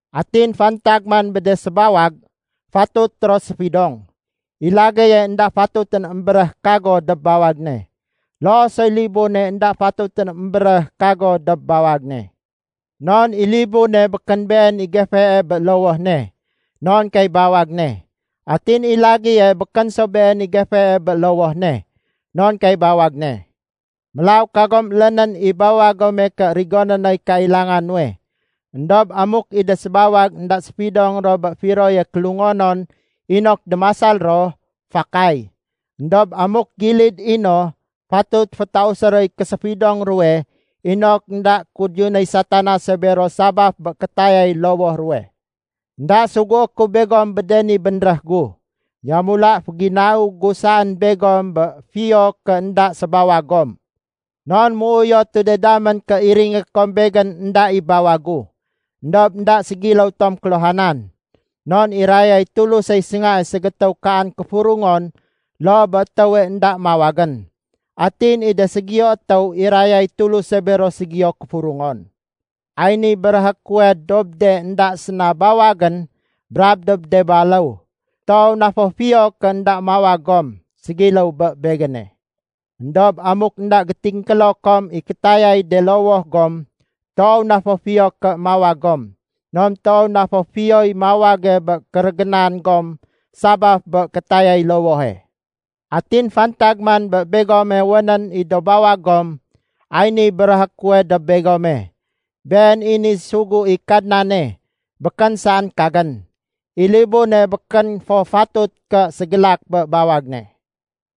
Atin fantag man bé de sébawag, fatut ro séfidong. I lagéye énda fatutén émbéréh “Kago” dob bawag ne. Loo soy libune énda fatutén émbéréh “Kago” dob bawag ne. Non i libune békén been i gefee bé lowoh ne, non kay bawag ne. Atin i lagéye békén so been i gefee bé lowoh ne, non kay bawag ne. Mélaw kagom élénén i bawag gome ké rigoné noy kailanga nuwe. Endob amuk i de sébawag énda séfidong ro bé firoye kélungonon inok démasal ro, fakay. Endob amuk gilid i no, fatut fétausé roy késéfidong ruwe inok énda kudiyunéy Satanase bero sabaf bé kétayay lowoh ruwe. Enda sugué ku begom bé de ni bénréh gu. Yamula féginau gu saén begom bé fiyo ké énda sébawag gom. Non méuyotu de damén ké iringé kom begén énda i bawag gu. Endob énda ségiléw tom kéluhanan. Non irayay Tulusey séngae ségétéw kaan kéfurungon loo bé étéwe énda mawagén. Atin i de ségiyo étéw, irayay Tuluse bero ségiyo kéfurungon. Ay niy béréhé kuwe dob de énda séna bawagén brab dob de baléw: Toow na fo fiyo ké énda mawag gom, ségiléw bé begéne. Endob amuk énda gétingkélo kom i kétayay de lowoh gom, toow na fo fiyo ké mawag gom. Non toow na fo fiyoy mawage bé kérégénan gom sabaf bé kétayay lowohe. Atin fantag man bé begome wénén i do bawag gom, ay niy béréhé kuwe dob begome. Been i niy sugu i Kadnane, békén saén kagén. I libune békén fo fatut ké ségélak bé bawag ne.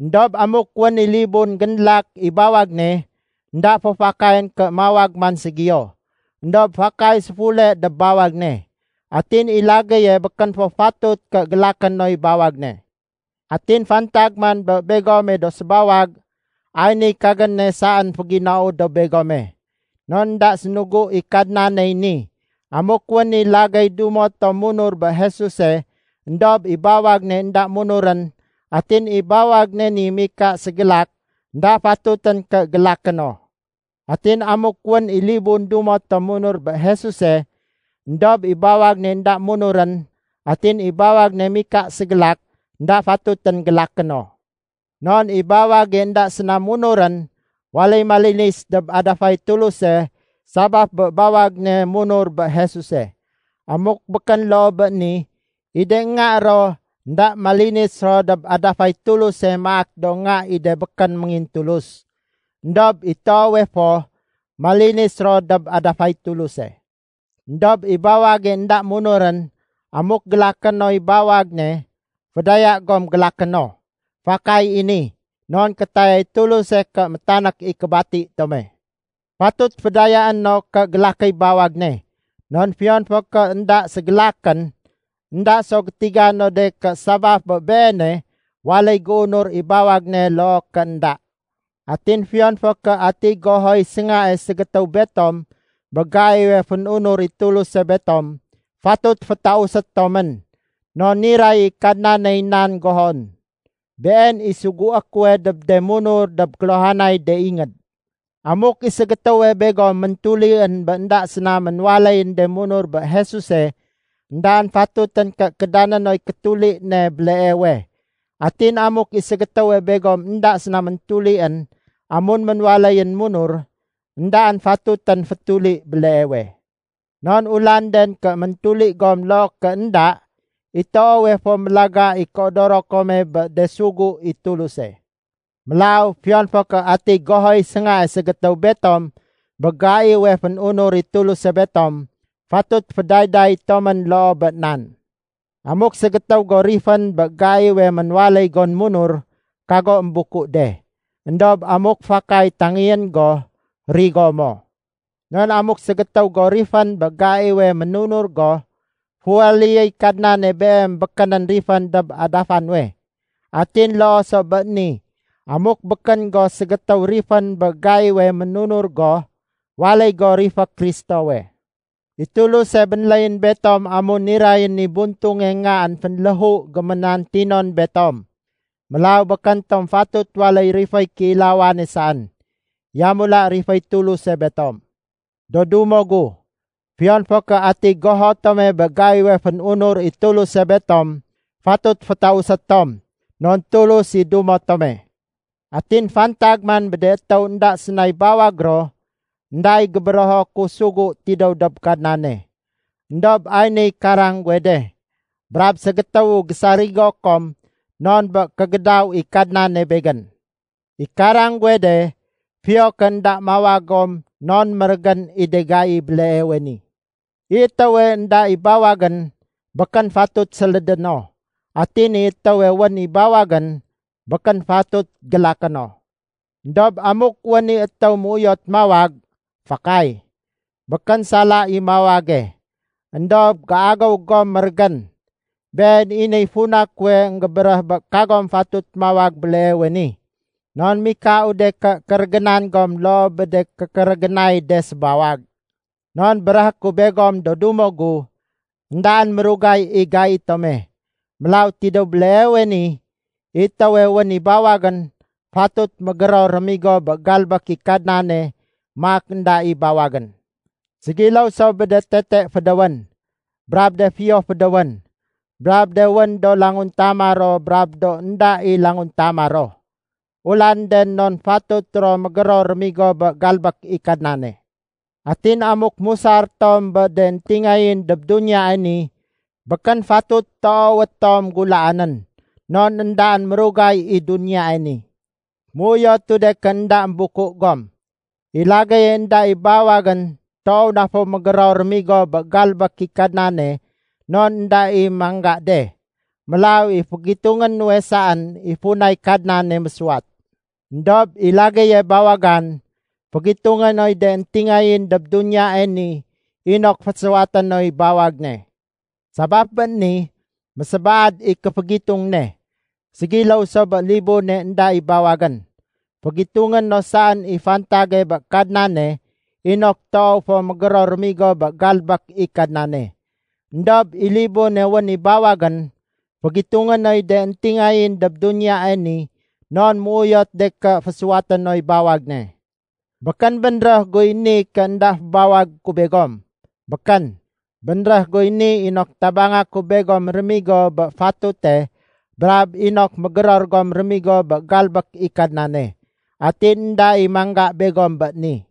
Endob amuk wén i libun génlak i bawag ne, énda fo fakayén ké mawag man ségiyo. Endob fakay séfule dob bawag ne. Atin i lagéye békén fo fatut ké gélaké noy bawag ne. Atin fantag man bé begome do sébawag, ay niy kagéne saén féginau dob begome. (Non énda sénugu i Kadnaney ni.) Amuk wén i lagéy dumo tom munur bé Jesuse éndob i bawag ne énda munurén, atin i bawag ne ni mika ségélak, énda fatutén ké gélaké no. Atin amuk wén i libun dumo tom munur bé Jesuse, éndob i bawag ne énda munurén, atin i bawag ne mika ségélak, énda fatutén gélaké no. Non i bawage énda séna munurén, waléy malinis dob adafay Tuluse sabaf bé bawag ne munur bé Jesuse. Amuk békén loo bé ni, i de nga ro énda malinis ro dob adafay Tuluse maak do nga i de békén méngintulus. Endob i toowe fo, malinis ro dob adafay Tuluse. Endob i bawage énda munurén, amuk gélaké noy bawag ne, fédaya gom gélaké no. Fakay i ni, non kétayay Tuluse ké métanék i kébati tome. Fatut fédayaé no ké gélakéy bawag ne, non fiyon fo ké énda ségélakén, énda so gétiga no de ké sabaf bé beene waléy géunur i bawag ne loo ké énda. Atin fiyon fo ké atiy gohoy séngae ségétéw betom bé gaiwe fén-unur i Tuluse betom fatut fétausé tomén. Non niray i Kadnaney nan gohon. Been i sugué kuwe dob de munur dob kéluhanay de ingéd. Amuk i ségétéwe begom méntulién bé énda séna ménwaléyén de munur bé Jesuse, éndaén fatutén ké kédané noy kétuli ne béleewe. Atin amuk i ségétéwe begom énda séna méntulién amun ménwaléyén munur, éndaén fatutén fétuli béleewe. Non ulanden ké méntuli gom loo ké énda. I toowe fo mélaga i kéodoro kome bé de sugu i Tuluse. Mélaw fiyon fo ké atiy gohoy séngae ségétéw betom bé gaiwe fén-unur i Tuluse betom, fatut fédayday tomén loo bé nan. Amuk ségétéw go rifén bé gaiwe ménwaléy gon munur, kago émbuku de. Endob amuk fakay tangéyén go, rigo mo. Non amuk ségétéw go rifén bé gaiwe ménunur go, féwaléyéy Kadnane beem békénén rifén dob adafa nuwe. Atin loo so bé ni, amuk békén go ségétéw rifén bé gaiwe ménunur go, waléy go rifé Kristowe. I Tuluse bénléyén betom amun nirayén i buntunge Ngaén fénléhu géménantinon betom. Mélaw békén tom fatut waléy riféy kéilawane saén. Yamula riféy Tuluse betom. Do dumo gu, fiyon fo ké atiy goho tome bé gaiwe fén-unur i Tuluse betom, fatut fétausé tom, non Tulus i dumo tome. Atin fantag man bé de étéw énda sénay bawag ro, énda i gébérého ku sugu tidéw dob Kadnane. Endob ay niy karang guwe de, brab ségétéwu gésarigo kom non bé kégédaw i Kadnane begén. I karang guwe de, fiyo ké énda mawag gom non mérégén i de gai béleewe ni. I étéwe énda i bawagén, békén fatut sélédé no. Atin i étéwe wén i bawagén, békén fatut gélaké no. Endob amuk wén i étéw méuyot mawag, fakay. Békén sala i mawage. Endob géagéw gom mérégén. Been i niy funa kuwe énggébéréh bé kagom fatut mawag béleewe ni, non mikau de ké kérégénan gom loo bé de kékérégénay de sébawag. Non béréhé ku begom do dumo gu, éndaén mérugay i gai tome. Mélaw tidéw béleewe ni, i étéwé wén i bawagén, fatut mégéror rémigo bé galbék i Kadnane maak énda i bawagén. Ségiléw so bé de tete fédéwén, brab de fiyo fédéwén, brab de wén do languntama ro brab do énda i languntama ro. Ulanden non fatut ro mégéror rémigo bé galbék i Kadnane. Atin amuk musar tom bé de éntingayén dob duniyae ni, békén fatut toowé tom gulaanén. Non éndaén mérugay i duniyae ni. Méuyotu de fo ké énda émbuku gom. I lagéye énda i bawagén toow na fo mégéror rémigo bé galbék i Kadnane non énda i mangga de. Mélaw i fégitungé nuwe saén i funay Kadnane mésuwat. Endob i lagéye bawagan, fégitungé noy de éntingayén dob duniyae ni inok fésuwaté noy bawag ne. Sabaf bé ni, mésébaad i kéfégitung ne. Ségiléw so bé libune énda i bawagén, fégitungé no saén i fantage bé Kadnane inok toow fo mégéror rémigo bé galbék i Kadnane. Endob i libune wén i bawagén, fégitungé noy de éntingayén dob duniyae ni non méuyot de ké fésuwaté noy bawag ne. Békén bénréh guy ni ké énda fébawagé ku begom. Békén! Bénréh guy ni inok tabanga ku begom rémigo bé fatute brab inok mégéror gom rémigo bé galbék i Kadnane, atin énda i mangga begom bé ni.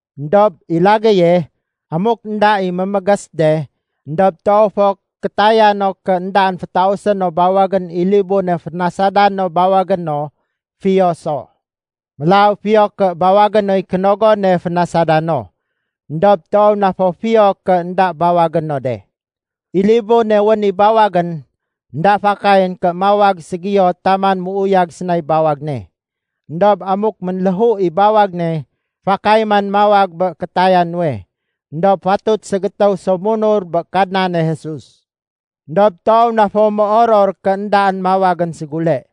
Endob i lagéye, amuk énda i mémégés de éndob toow fo kétaya no ké éndaén fétausé no bawagén i libune fénasada no bawagé no, fiyo so. Mélaw, fiyo ké bawagé noy kénogone fénasada no. Endob toow na fo fiyo ké énda bawagé no de. I libune wén i bawagén, énda fakayén ké mawag ségiyo taman méuyag sénay bawag ne. Endob amuk ménléhu i bawag ne, fakay man mawag bé kétaya nuwe, éndob fatut ségétéw so munur bé Kadnane Jesus. Endob toow na fo méoror ké éndaén mawagén ségule.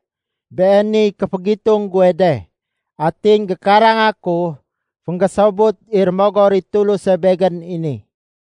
Beeniy kéfégitung guwe de. Atin gékaranga ku, fénggésobut i Rémogor i Tuluse begén i ni.